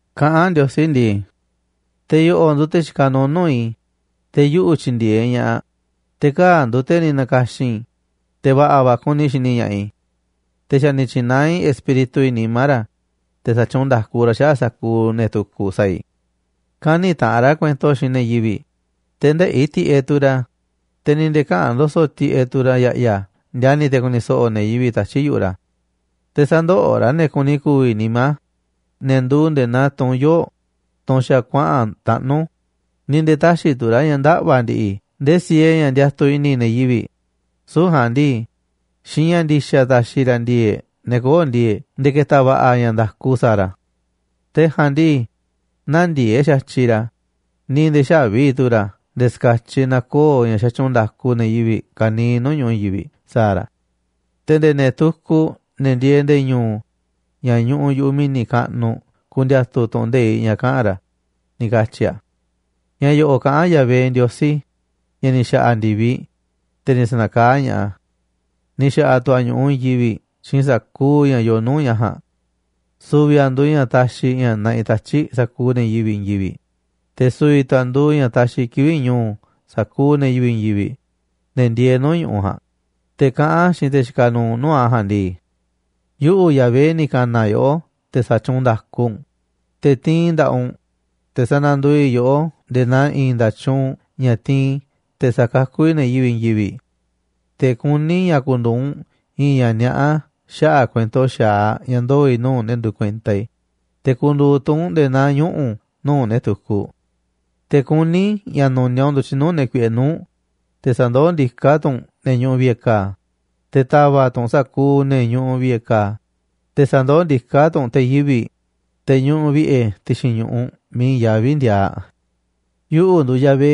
Kaꞌán Ndiosí ndii: “Te̱ yo̱ꞌo̱ꞌ nduuꞌ te̱ xikaꞌ nuuꞌ nuu̱ꞌ i̱, te̱ yuꞌu̱ tyindieeꞌ ña̱ꞌaꞌ, te̱ kaa̱ꞌ nduuꞌ te̱ ni̱ na̱ka̱xi̱n i̱, te̱ va̱ꞌa̱ va̱ kuni i̱ xini ña̱ꞌaꞌ i̱. Te̱ xa̱ ni̱ tyi̱naá i̱ Espíritu i̱ nimá ra̱, te̱ sa̱tyuunꞌ nda̱ku ra̱ xaꞌa̱ꞌ sa̱kuuꞌ ne̱ tukuꞌ sa̱a̱ i̱. Kä̱ni̱ taꞌanꞌ ra̱ kuento xiinꞌ ne̱ yivi̱ꞌ, te̱ ndëꞌi̱ tiꞌeꞌ tu̱ ra̱, te̱ ni̱ nde̱e̱ käꞌa̱n ndo̱so̱ꞌ tiꞌeꞌ tu̱ ra̱ ya̱ꞌya̱ ndiani̱ te̱ ku̱ni̱ so̱ꞌo̱ ne̱ yivi̱ꞌ tatyi̱ꞌ yu̱ꞌuꞌ ra̱. Te̱ sä̱ndoꞌoꞌ ra̱ ne̱ kuni ku̱vi̱ nimá, ne̱ nduuꞌ nde̱e̱ naa tunꞌ yoo̱ꞌ, tunꞌ xa̱ kuaꞌa̱n taꞌnú, ni̱ nde̱e̱ tä̱xi̱ tu̱ ra̱ ña̱ ndaꞌva̱ ndi̱ꞌi̱ ndee siee ña̱ ndiatuꞌ i̱ni̱ ne̱ yivi̱ꞌ. Süu̱ꞌ ja̱a̱nꞌ ndii, xiinꞌ ña̱ ndi̱xa̱ ta̱xi̱ ra̱ ndi̱e̱e̱ꞌ ne̱ kö̱o̱ꞌ ndi̱e̱e̱ꞌ nde̱e̱ ke̱ta̱ va̱ꞌa̱ ña̱ nda̱ku sa̱a̱ ra̱. Te̱ ja̱a̱nꞌ ndii, nä̱ndiee̱ꞌ xa̱tyiꞌ ra̱, ni̱ nde̱e̱ xä̱vi tu̱ ra̱ nde̱e̱ ska̱tyiꞌ na̱koo̱ ña̱ xatyuunꞌ nda̱ku ne̱ yivi̱ꞌ ka̱niiꞌ nuu̱ꞌ ñu̱ꞌuꞌ i̱i̱n yivi̱ꞌ sa̱a̱ ra̱. Te̱ nde̱e̱ ne̱ tukuꞌ, ne̱ ndieeꞌ nde̱e̱ ñu̱u̱ ña̱ ñuꞌuꞌ yu̱ꞌuꞌ mi̱ni̱ kaꞌnuꞌ ku̱ndi̱a̱tu̱ tu̱ꞌu̱n nde̱iꞌ ña̱ kaꞌa̱n ra̱”, ni̱ katyi̱ a̱. Ña̱ yo̱ꞌo̱ꞌ kaꞌán Yahvé, Ndiosí ña̱ ni̱ xa̱ꞌa̱ ndi̱viꞌ, te̱ ni̱ sa̱nakaá ña̱ꞌaꞌ a̱. Ni̱ xa̱ꞌa̱ tu̱ a̱ ñu̱ꞌuꞌ i̱i̱n yivi̱ꞌ xiinꞌ sa̱kuuꞌ ña̱ yooꞌ nuu̱ꞌ ña̱ ja̱a̱nꞌ. Su̱vi̱ a̱ nduuꞌ ña̱ taxiꞌ ña̱ naꞌiꞌ tatyi̱ꞌ sa̱kuuꞌ ne̱ yivi̱ꞌ i̱i̱n yivi̱ꞌ, te̱ su̱vi̱ tu̱ a̱ nduuꞌ ña̱ taxiꞌ kivi̱ꞌ ñu̱u̱ sa̱kuuꞌ ne̱ yivi̱ꞌ i̱i̱n yivi̱ꞌ, ne̱ ndieeꞌ nuu̱ꞌ ñu̱ꞌuꞌ ja̱a̱nꞌ, te̱ kaꞌán a̱ xiinꞌ te̱ xikaꞌ nuuꞌ nuu̱ꞌ a̱ ja̱a̱nꞌ ndii: “Yuꞌu̱, Yahvé, ni̱ ka̱na̱ yoꞌó te̱ sa̱tyuunꞌ nda̱ku u̱nꞌ, te̱ tiinꞌ i̱ nda̱ꞌaꞌ u̱nꞌ, te̱ sa̱na̱nduuꞌ i̱ yoꞌó nde̱e̱ naa i̱i̱n nda̱tyuunꞌ ña̱ tiinꞌ i̱ te̱ sa̱kakú i̱ ne̱ yivi̱ꞌ i̱i̱n yivi̱ꞌ. Te̱ kuní i̱ ña̱ ku̱ndu̱u̱ u̱nꞌ i̱i̱n ña̱ niaꞌá xaꞌa̱ꞌ kuento xa̱aꞌ ña̱ ndoo̱ i̱ nuu̱ꞌ ne̱ nduuꞌ kuenta i̱, te̱ ku̱ndu̱u̱ tu̱ u̱nꞌ nde̱e̱ naa ñuꞌu̱ nuu̱ꞌ ne̱ tukuꞌ. Te̱ kuní i̱ ña̱ nu̱niaꞌ u̱nꞌ ndu̱tyiꞌ nuu̱ꞌ ne̱ kuiꞌe nuu̱ꞌ, te̱ sa̱ndoó ndiká tu̱ u̱nꞌ ne̱ ñuꞌuꞌ vi̱ꞌe̱ ka̱a̱, te̱ ta̱va̱ꞌ tu̱ u̱nꞌ sa̱kuuꞌ ne̱ ñuꞌuꞌ vi̱ꞌe̱ ka̱a̱, te̱ sa̱ndoó ndiká tu̱ u̱nꞌ te̱ yivi̱ꞌ, te̱ ñuꞌuꞌ vi̱ꞌe̱ ti̱xi̱n ñu̱ꞌuꞌ miiꞌ i̱i̱n yaví ndiaaꞌ. ’Yuꞌu̱ nduuꞌ Yahvé,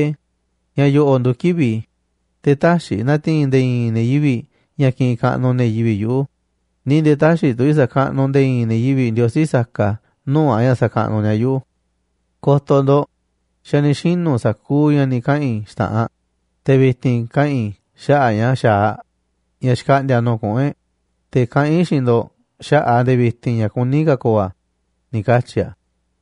ña̱ yo̱ꞌo̱ꞌ nduuꞌ kivi̱ꞌ i̱. Te̱ tä̱xi̱ i̱ na̱ti̱i̱n nde̱e̱ i̱i̱n ne̱ yivi̱ꞌ ña̱ kiꞌinꞌ kaꞌnuꞌ ne̱ yivi̱ꞌ yuꞌu̱, ni̱ nde̱e̱ tä̱xi̱ tu̱ i̱ sa̱kaꞌnuꞌ nde̱e̱ i̱i̱n ne̱ yivi̱ꞌ ndiosí saka nuu̱ꞌ a̱ ña̱ sa̱kaꞌnuꞌ ni̱a̱ yuꞌu̱. Ko̱to̱ ndo̱ꞌ, xa̱ ni̱ xinu̱ sa̱kuuꞌ ña̱ ni̱ kaꞌa̱n i̱ xta̱ꞌanꞌ, te̱ vi̱ti̱n kaꞌa̱n i̱ xaꞌa̱ꞌ ña̱ xa̱aꞌ ña̱ xkaꞌndi̱a̱ nuu̱ꞌ kuꞌu̱n e̱ꞌ, te̱ kaꞌán i̱ xiinꞌ ndo̱ꞌ xaꞌa̱ꞌ a̱ nde̱e̱ vi̱ti̱n ña̱ kuní ka̱ ko̱o̱ a̱”, ni̱ katyi̱ a̱.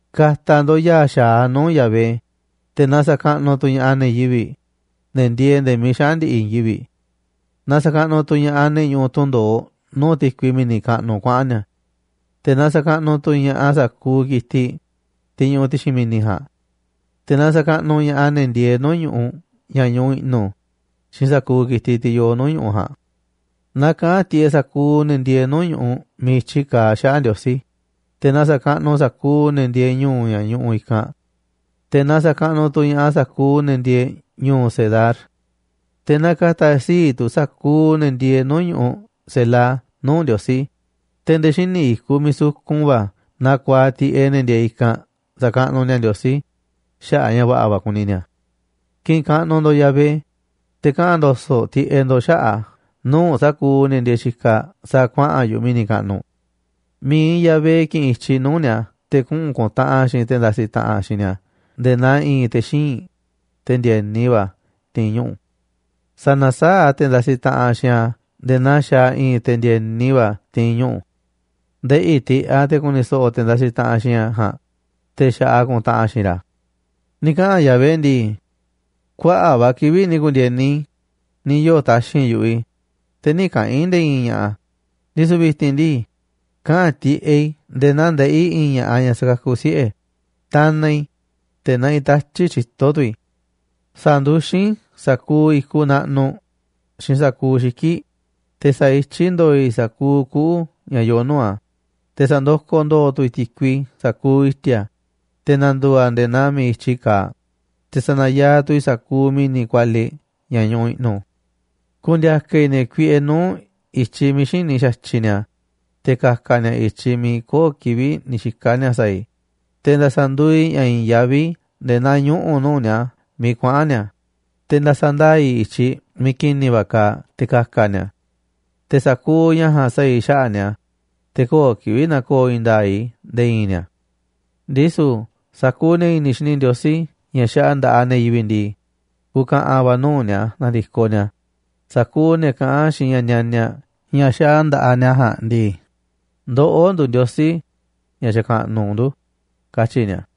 Ka̱ta̱ ndo̱ꞌ ya̱a̱ xa̱aꞌ nuu̱ꞌ Yahvé, te̱ na sa̱kaꞌnuꞌ tu̱ ña̱ꞌaꞌ ne̱ yivi̱ꞌ, ne̱ ndieeꞌ nde̱e̱ miiꞌ xaꞌa̱n ndi̱ꞌi̱ i̱i̱n yivi̱ꞌ. Na sa̱kaꞌnuꞌ tu̱ ña̱ꞌaꞌ ne̱ ñuꞌuꞌ tunꞌ ndo̱oꞌ nuu̱ꞌ ti̱kui mi̱ni̱ kaꞌnuꞌ kuaꞌa̱n ni̱a̱. Te̱ na sa̱kaꞌnuꞌ tu̱ ña̱ꞌaꞌ sa̱kuuꞌ ki̱tiꞌ, tiꞌ ñuꞌuꞌ ti̱xi̱n mi̱ni̱ ja̱a̱nꞌ. Te̱ na sa̱kaꞌnuꞌ ña̱ꞌaꞌ ne̱ ndieeꞌ nuu̱ꞌ ñu̱ꞌuꞌ ña̱ ñuꞌuꞌ i̱ꞌnu̱ xiinꞌ sa̱kuuꞌ ki̱tiꞌ tiꞌ yoo nuu̱ꞌ ñu̱ꞌuꞌ ja̱a̱nꞌ. Na kaꞌa̱n tiꞌeꞌ sa̱kuuꞌ ne̱ ndieeꞌ nuu̱ꞌ ñu̱ꞌuꞌ miiꞌ i̱tyi kaaꞌ xaꞌa̱ꞌ Ndiosí, te̱ na sa̱kaꞌnuꞌ sa̱kuuꞌ ne̱ ndieeꞌ ñu̱u̱ ña̱ ñuꞌuꞌ i̱kanꞌ. Te̱ na sa̱kaꞌnuꞌ tu̱ ña̱ꞌaꞌ sa̱kuuꞌ ne̱ ndieeꞌ ñu̱u̱ Cedar. Te̱ na ka̱ta̱ sii̱ꞌ tu̱ sa̱kuuꞌ ne̱ ndieeꞌ nuu̱ꞌ ñu̱ꞌuꞌ Sela nuu̱ꞌ Ndiosí, te̱ nde̱e̱ xíniꞌ i̱kuꞌ miiꞌ sukun va̱ na ku̱a̱aꞌ tiꞌeꞌ ne̱ ndieeꞌ i̱kanꞌ sa̱kaꞌnuꞌ ni̱a̱ Ndiosí xaꞌa̱ꞌ a̱ ña̱ va̱ꞌa̱ va̱ kuni ni̱a̱. Ki̱ꞌi̱n kaꞌnuꞌ ndo̱ꞌ Yahvé, te̱ kaꞌa̱n ndo̱so̱ꞌ tiꞌeꞌ ndo̱ꞌ xaꞌa̱ꞌ a̱ nuu̱ꞌ sa̱kuuꞌ ne̱ ndieeꞌ xikaꞌ sa̱a̱ kuaꞌa̱n yu̱ꞌuꞌ mi̱ni̱ kaꞌnuꞌ. Mi̱iꞌ Yahvé ki̱ꞌi̱n i̱tyiꞌ nuu̱ꞌ ni̱a̱ te̱ kuꞌu̱n ku̱ntaꞌanꞌ a̱ xiinꞌ te̱ ndasiꞌ taꞌanꞌ xiinꞌ ni̱a̱ nde̱e̱ naa i̱i̱n te̱ xíinꞌ, te̱ ndi̱e̱ni va̱ ti̱i̱n ñuꞌu̱. Sa̱na̱saáꞌ a̱ te̱ ndasiꞌ taꞌanꞌ xiinꞌ a̱ nde̱e̱ naa xaaꞌ i̱i̱n te̱ ndi̱e̱ni va̱ ti̱i̱n ñuꞌu̱. Ndeꞌi̱ tiꞌeꞌ a̱ te̱ ku̱ni̱ so̱ꞌo̱ te̱ ndasiꞌ taꞌanꞌ xiinꞌ a̱ ja̱a̱nꞌ, te̱ xa̱ꞌaꞌ a̱ ku̱ntaꞌanꞌ a̱ xiinꞌ ra̱. Ni̱ kaꞌa̱n Yahvé ndii: “Kuaꞌa̱ꞌ va̱ kivi̱ꞌ ni̱ ku̱ndi̱e̱ni i̱, ni̱ yoo̱ taxi̱nꞌ yu̱ꞌuꞌ i̱, te̱ nï̱ kaꞌa̱n i̱ nde̱e̱ i̱i̱n ña̱ꞌa̱, ndisu̱ vi̱ti̱n ndii, kaꞌa̱n tiꞌeꞌ i̱ nde̱e̱ naa ndeꞌí i̱i̱n ña̱ꞌaꞌ ñaꞌ sakakuꞌ siꞌe̱. Tanaꞌ i̱, te̱ naꞌiꞌ tatyi̱ꞌ tyito̱ tu̱ i̱. Sa̱nduxín i̱ sa̱kuuꞌ i̱kuꞌ naꞌnuꞌ xiinꞌ sa̱kuuꞌ xiki̱ꞌ, te̱ sa̱ityí ndo̱o̱ i̱ sa̱kuuꞌ kuꞌu̱ ña̱ yoo nuu̱ꞌ a̱. Te̱ sa̱ndokoꞌ ndo̱o̱ tu̱ i̱ ti̱kui sa̱kuuꞌ i̱ti̱a̱, te̱ na̱ndu̱u̱ a̱ nde̱e̱ naa miiꞌ i̱tyi kaaꞌ, te̱ sa̱na̱yaaꞌ tu̱ i̱ sa̱kuuꞌ mi̱ni̱ kualiꞌ ña̱ ñuꞌuꞌ i̱ꞌnu̱. Ku̱ndi̱a̱ka̱ i̱ ne̱ kuiꞌe nuu̱ꞌ i̱tyiꞌ miiꞌ xïní xa̱tyiꞌ ni̱a̱, te̱ ka̱ka̱ ni̱a̱ i̱tyiꞌ miiꞌ köo̱ꞌ kivi̱ꞌ ni̱ xika̱ ni̱a̱ sa̱a̱ i̱. Te̱ nda̱sa̱ nduuꞌ i̱ ña̱ i̱i̱n yaví nde̱e̱ naa ñuꞌu̱ nuu̱ꞌ ni̱a̱ miiꞌ kuaꞌa̱n ni̱a̱, te̱ nda̱sa̱ ndaa̱ i̱ i̱tyiꞌ miiꞌ ki̱ni̱ va̱ kaaꞌ te̱ ka̱ka̱ ni̱a̱. Te̱ sa̱kuuꞌ ña̱ ja̱a̱nꞌ sa̱a̱ i̱ xaꞌa̱ꞌ ni̱a̱, te̱ köo̱ꞌ kivi̱ꞌ na̱ko̱o̱ i̱i̱n nda̱a̱ꞌ i̱ nde̱e̱ i̱i̱n ni̱a̱. Ndisu̱ sa̱kuuꞌ ne̱ i̱ni̱ xini ndiosí ña̱ xaꞌa nda̱ꞌaꞌ ne̱ yivi̱ꞌ ndii, ku̱ka̱ꞌa̱n va̱ nuu̱ꞌ ni̱a̱ na̱ndi̱koꞌ ni̱a̱, sa̱kuuꞌ ne̱ kaꞌán xiinꞌ ña̱ nianiaꞌ ña̱ xaꞌaꞌ nda̱ꞌaꞌ ni̱a̱ ja̱a̱nꞌ ndii: Ndoꞌó nduuꞌ ndiosí ña̱ xakaꞌnuꞌ ndu̱, katyi̱ ni̱a̱.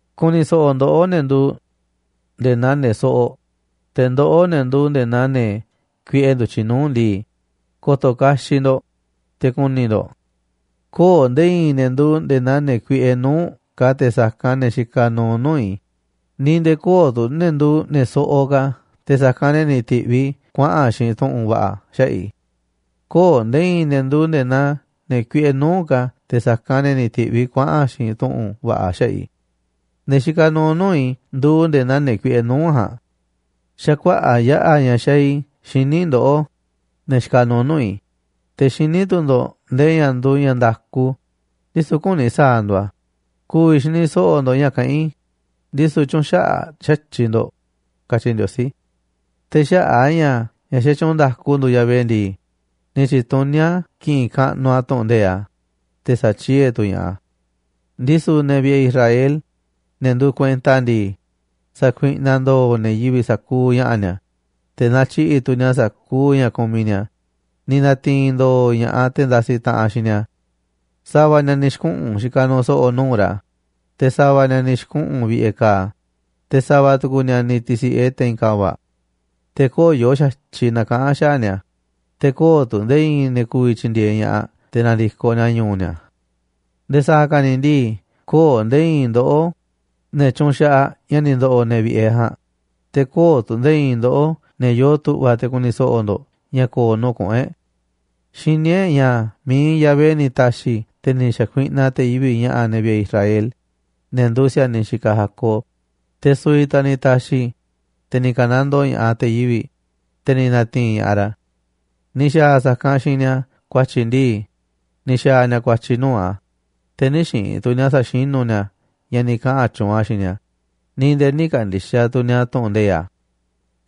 ’Ku̱ni̱ so̱ꞌo̱ ndoꞌó, ne̱ nduuꞌ nde̱e̱ naa ne̱ soꞌoꞌ, te̱ ndoꞌó, ne̱ nduuꞌ nde̱e̱ naa ne̱ kuiꞌe ndu̱tyiꞌ nuu̱ꞌ ndii, ko̱to̱ kaxiꞌ ndo̱ꞌ, te̱ ku̱ni̱ ndo̱ꞌ. Köo̱ꞌ nde̱e̱ i̱i̱n ne̱ nduuꞌ nde̱e̱ naa ne̱ kuiꞌe nuu̱ꞌ ka̱ te̱ sa̱kanꞌ ne̱ xikaꞌ nuuꞌ nuu̱ꞌ i̱, ni̱ nde̱e̱ köo̱ꞌ tu̱ ne̱ nduuꞌ ne̱ soꞌoꞌ ka̱ te̱ sa̱kanꞌ ne̱ ni̱ ti̱ꞌviꞌ i̱ kuaꞌa̱n xiinꞌ tu̱ꞌu̱n va̱ꞌa̱ xaꞌa̱ꞌ i̱. Köo̱ꞌ nde̱e̱ i̱i̱n ne̱ nduuꞌ nde̱e̱ naa ne̱ kuiꞌe nuu̱ꞌ ka̱ te̱ sa̱kanꞌ ne̱ ni̱ ti̱ꞌviꞌ i̱ kuaꞌa̱n xiinꞌ tu̱ꞌu̱n va̱ꞌa̱ xaꞌa̱ꞌ i̱. Ne̱ xikaꞌ nuuꞌ nuu̱ꞌ i̱ nduuꞌ nde̱e̱ naa ne̱ kuiꞌe nuu̱ꞌ ja̱a̱nꞌ. Xa̱ kuaꞌa̱ꞌ yaꞌa̱ ña̱ xaaꞌ i̱ xini ndoꞌó, ne̱ xikaꞌ nuuꞌ nuu̱ꞌ i̱, te̱ xiní tu̱ ndo̱ꞌ ndee ña̱ nduuꞌ ña̱ nda̱ku, ndisu̱ küni sa̱a̱ ndo̱ꞌ a̱ ku̱vi̱ xini so̱ꞌo̱ ndo̱ꞌ ña̱ kaꞌán i̱, ndisu̱ tyüunꞌ xaꞌaꞌ xa̱tyiꞌ ndo̱ꞌ”, katyi Ndiosí. Te̱ xaꞌa̱ꞌ a̱ ña̱ ña̱ xatyuunꞌ nda̱ku nduuꞌ Yahvé ndii, ni̱ tyi̱tuní a̱ ki̱ꞌi̱n kaꞌnuꞌ a̱ tu̱ꞌu̱n nde̱iꞌ a̱, te̱ sa̱tyie̱ tu̱ ña̱ꞌaꞌ a̱. Ndisu̱ ne̱ vi̱ꞌe̱ i̱ Israel, ne̱ nduuꞌ kuenta a̱ ndii, sa̱kuiꞌnaꞌ ndooꞌ ne̱ yivi̱ꞌ sa̱kuuꞌ ña̱ꞌa̱ ni̱a̱, te̱ na̱tyiꞌi̱ꞌ tu̱ ni̱a̱ sa̱kuuꞌ ña̱ kumiꞌ ni̱a̱. Ni̱ na̱ti̱i̱n ndo̱o̱ ña̱ꞌaꞌ te̱ ndasiꞌ taꞌanꞌ xiinꞌ ni̱a̱. Sa̱va̱ ni̱a̱ ni̱ xi̱kuꞌu̱n xikaꞌ nuuꞌ so̱ꞌo̱ nuu̱ꞌ ra̱, te̱ sa̱va̱ ni̱a̱ ni̱ xi̱kuꞌu̱n ñuꞌuꞌ vi̱ꞌe̱ ka̱a̱, te̱ sa̱va̱ tu̱ku̱ ni̱a̱ ni̱ ti̱si̱ꞌe te̱i̱n ka̱va̱ꞌ. Te̱ köo̱ꞌ yooꞌ xa̱tyiꞌ na̱kaꞌa̱n xaꞌa̱ꞌ ni̱a̱, te̱ köo̱ꞌ tu̱ nde̱e̱ i̱i̱n ne̱ ku̱vi̱ tyi̱ndi̱e̱eꞌ ña̱ꞌaꞌ te̱ na̱ndi̱koꞌ ni̱a̱ ñu̱u̱ ni̱a̱. Nde̱e̱ sa̱a̱ ka̱ ni̱ ndii köo̱ꞌ nde̱e̱ i̱i̱n ndoꞌó, ne̱ tyunxaꞌaꞌ ña̱ ni̱ ndo̱ꞌo̱ ne̱ vi̱ꞌe̱ e̱ ja̱a̱nꞌ, te̱ köo̱ꞌ tu̱ nde̱e̱ i̱i̱n ndoꞌó ne̱ yoo tu̱ꞌva̱ te̱ ku̱ni̱ so̱ꞌo̱ ndo̱ꞌ ña̱ ko̱o̱ nuu̱ꞌ kuꞌu̱n e̱ꞌ. Xiní e̱ꞌ ña̱ mi̱iꞌ Yahvé ni̱ ta̱xi̱ te̱ ni̱ xa̱kuiꞌnaꞌ te̱ yivi̱ꞌ ña̱ꞌa̱ ne̱ vi̱ꞌe̱ e̱ Israel, ne̱ nduuꞌ si̱a̱niꞌ xikaꞌ Jacob, te̱ su̱vi̱ tu̱ a̱ ni̱ ta̱xi̱, te̱ ni̱ ka̱nandoo ña̱ꞌaꞌ te̱ yivi̱ꞌ, te̱ ni̱ na̱ti̱i̱n ña̱ꞌaꞌ ra̱. Ni̱ xa̱a̱ a̱ sa̱kanꞌ xiinꞌ ni̱a̱ ku̱a̱tyi̱ ndii, ni̱ xa̱a̱ ni̱a̱ ku̱a̱tyi̱ nuu̱ꞌ a̱, te̱ nï̱ xiinꞌ tu̱ ni̱a̱ sa̱xinu̱ ni̱a̱ ña̱ ni̱ kaꞌa̱n tyuunꞌ a̱ xiinꞌ ni̱a̱, ni̱ nde̱e̱ nï̱ ka̱ndi̱xaꞌ tu̱ ni̱a̱ tu̱ꞌu̱n nde̱iꞌ a̱.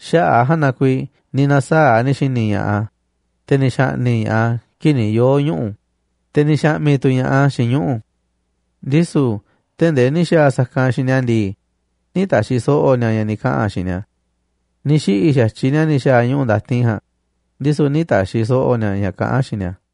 Xaꞌa̱ꞌ a̱ ja̱a̱nꞌ na kuiiꞌ ni̱ na̱saa̱ꞌ ni̱ xi̱ni̱ ña̱ꞌaꞌ a̱, te̱ ni̱ xa̱ꞌni̱ꞌ ña̱ꞌaꞌ a̱ kii̱ꞌ ni̱ yoo̱ ñuꞌu̱, te̱ ni̱ xa̱ꞌmi̱ tu̱ ña̱ꞌaꞌ a̱ xiinꞌ ñuꞌu̱. Ndisu̱ tee̱ꞌ ndee ni̱ xa̱a̱ a̱ sa̱kanꞌ xiinꞌ ni̱a̱ ndii, nï̱ ta̱xi̱ so̱ꞌo̱ ni̱a̱ ña̱ ni̱ kaꞌa̱n a̱ xiinꞌ ni̱a̱, ni̱ xiꞌi̱ xa̱tyiꞌ ni̱a̱ ni̱ xa̱a̱ ñuꞌu̱ ndatin ja̱a̱nꞌ, ndisu̱ nï̱ ta̱xi̱ so̱ꞌo̱ ni̱a̱ ña̱ kaꞌán a̱ xiinꞌ ni̱a̱.